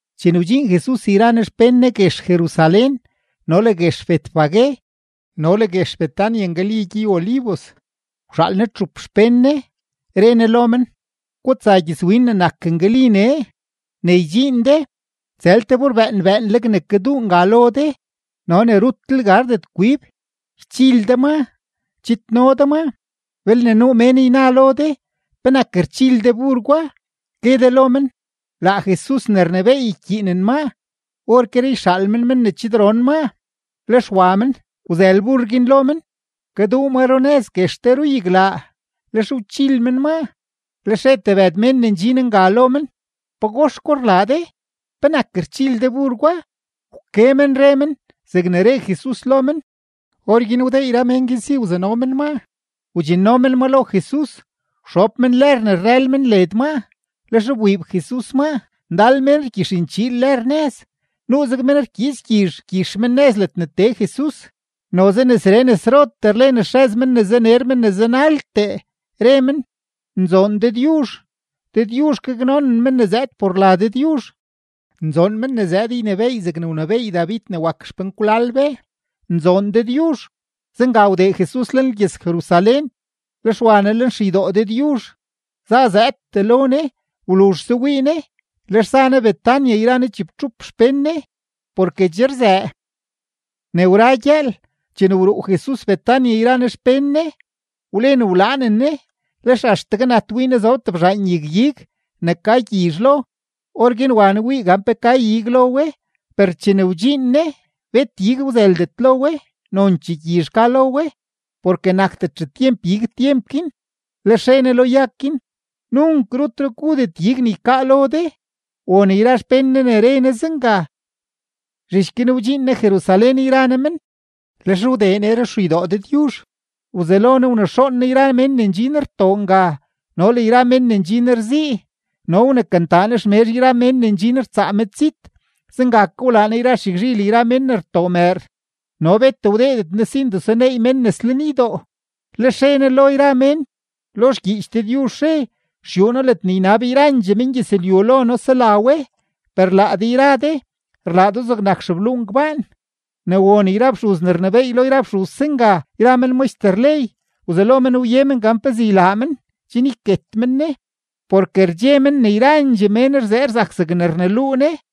Chene wdxiin Jesus yra Ne xpén Ne guex Jerusalén no le guex Betfagé no le guex Betania ngali gyey-Olivos, wxaal Ne txup xpén Ne, re Ne lo men: ―Gutsa gyëzwin ne nak ngali nee. Ne ydxiin de, tsël te bur bëën bëënleg ne kaduu nga lo de no ne rutlel gardet kwib. Ychil de ma, chidno de maa. Belne nuu mén yna lo de: “¿Penak rchil de bur gwa?”, gue de lo men: “Laa Jesus ne rnebééy ykyiinen maa. Orkeree yxaal men men ne chidron maa.” Lex wa men, wzël bur guin lo men, kaduu ma runëz guex te ruyaglaa; lex wchil men maa. Lex re tebëd mén ne ndxin nga lo men: ―¿Pagox gwa rlaa de? ¿Penak rchil de bur gwa? Wke men re men zegne re Jesus lo men. Orguin wdee yra mén guin si wzano men maa. Wdxinno men ma lo Jesus, wxob men lër ne rrël men led maa, lex wbiib Jesus maa. Ndal mén rgyixnchiil lër nëz, nuuzeg mén rkyiits gyizh rgyix men nëz ledne tee Jesus. Noze nesree nesrotee rlen xrëz men ne zaner men ne zanaltee, re men: ―¡Nzoon Dëdyuzh! ¡Dëdyuzh gaknonen men ne zëëd por la Dëdyuzh! ¡Nzoon men ne zëëd ynebééy zegne wnebééy David ne wak xpenkwlal be! ¡Nzoon Dëdyuzh! Zenga wdee Jesus lenlgyëz-Jerusalén, lex wa Ne lenxeydoo Dëdyuzh, zazëëdtee lo Ne. Wluzhse wii Ne, lex za Ne Betania yra Ne chibtxup xpén Ne, porke che rzëë. Ne wra gyëël chene wruu Jesus Betania yra Ne xpén Ne, wlen wlaanen Ne. Lex axtegue nat wii Ne zob tebzhaan yag-ig ne ka gyizh lo. Orguin wa Ne wii gan pe ka ig lo we, per chene wdxiin Ne, bet ig wzëldet lo we, nonchee gyizh ka lo we, porke nakdet xetyemp ig tyemp guin. Lex re Ne lo yag guin: ―Nunk rutre gudet ig ne ykaa lo de. Won yra xpén Ne re Ne zenga. Zhich guin wdxiin Jesus Jerusalén yra Ne men. Lex wdee Ne ruxeydoo Dëdyuzh, wzelo Ne wnexoon Ne yra mén ne ndxin rtoo nga no le yra mén ne ndxin rzii, no wnekantaa Ne xmezh yra mén ne ndxin rtsaa medzit; zenga ke wlaa Ne xyagzhil yra mén ne rtoo mëër; no bet wdeedet Ne si ndesuneey mén nes lenydoo. Lex re Ne lo yra mén: ―Lo xgyiich Dëdyuzh re: “Xyuu noo, ledne ynab yrandxee mengyëzlyu lo noo sela we”; per le laa de yra de rlaa do zegnak xebluu ngbaan. Ne won yra fxuz ne rnebééy lo yra fxuz zenga yra men maxter ley, wzelo men wye men gan pezee ylaa men chen yket men Ne, porke rdxe men ne yrandxee mén rzee rzak zeg rneluu Ne.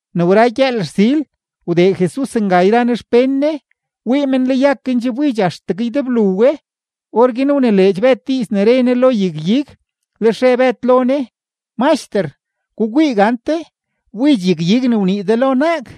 Ne wra gyëël rsil, wdee Jesus nga yra Ne xpén Ne, wii men le yag-ig guin che wbidx axtegue ydeblu we. Orguin wnileedx Bëd diiz ne re Ne lo yag-ig, lex re Bëd lo Ne: ―Maxter, gukwii gante, wbidx yag-ig ne wnii de lo naag.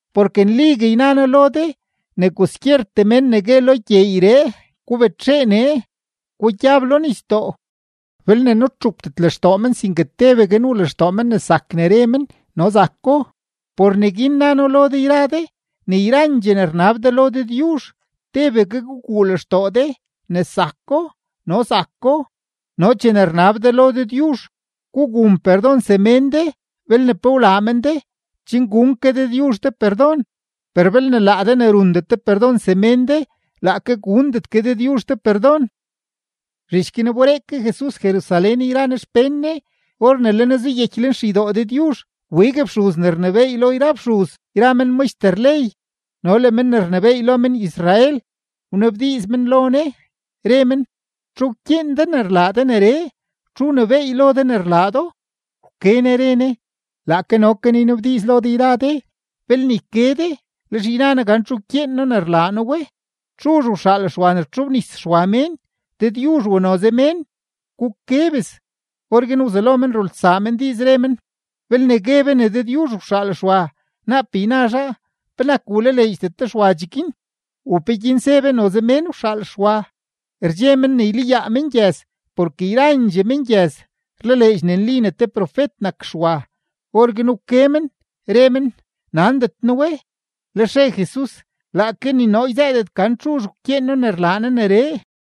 Porke nligue yna noo lo de ne kwaskyertee men ne gue lo gyeeyree: “Gubetxee nee, gugyab lo nisdoo”, belne nutxupdet lextoo men sinke tebegue nuu lextoo men ne zak ne re men, no zako. Por neguin na noo lo de yra de ne yrandxee ne rnab de lo Dëdyuzh, tebegue guguu lextoo de ne zako, no zako. No chene rnab de lo Dëdyuzh, gugun perdon semén de belne pe wlaa men de, chen gun ke Dëdyuzh de perdon. Per belne laa de ne rundet de perdon semén de, laake gundet ke Dëdyuzh de perdon. Zhich guin wberee ke Jesus Jerusalén yra Ne xpén Ne. Or ne le Ne zuyeky lenxeydoo Dëdyuzh, wbig fxuz ne rnebééy lo yra fxuz yra men maxter ley no le men ne rnebééy lo men-Israel, wnabdiiz men lo Ne, re men: ―¿Txu wkyeen de ne rlaa de neree? ¿Txu wnebééy lo de ne rlaa do? Wke Ne re Ne: ―Laake no ke noo ynabdiiz lo de yra de; belne yke de, lex yna noo gan txu wkyeen noo ne rlaa noo we. ¿Txuzh wxaal Xwa ne wtxobnis Xwa mén, Dëdyuzh u noze mén? Guke bes. Orguin wzelo men rulsaa men diiz, re men: ―Belne gue be ne Dëdyuzh wxaal Xwa, naap yna zhaa: “¿Penak wlaleedxdet de Xwa cheguin?” ¿U peguin ze be, noze mén wxaal Xwa? Rdxe men ne ylayaa mengyëz, porke yrandxee mengyëz rlaleedx ne nli ne te profet nak Xwa. Orguin wke men re men: ―Nandet noo we. Lex re Jesus: ―Laake ni noo yzëëdet gan txuzh wkyeen noo ne rlaa noo neree.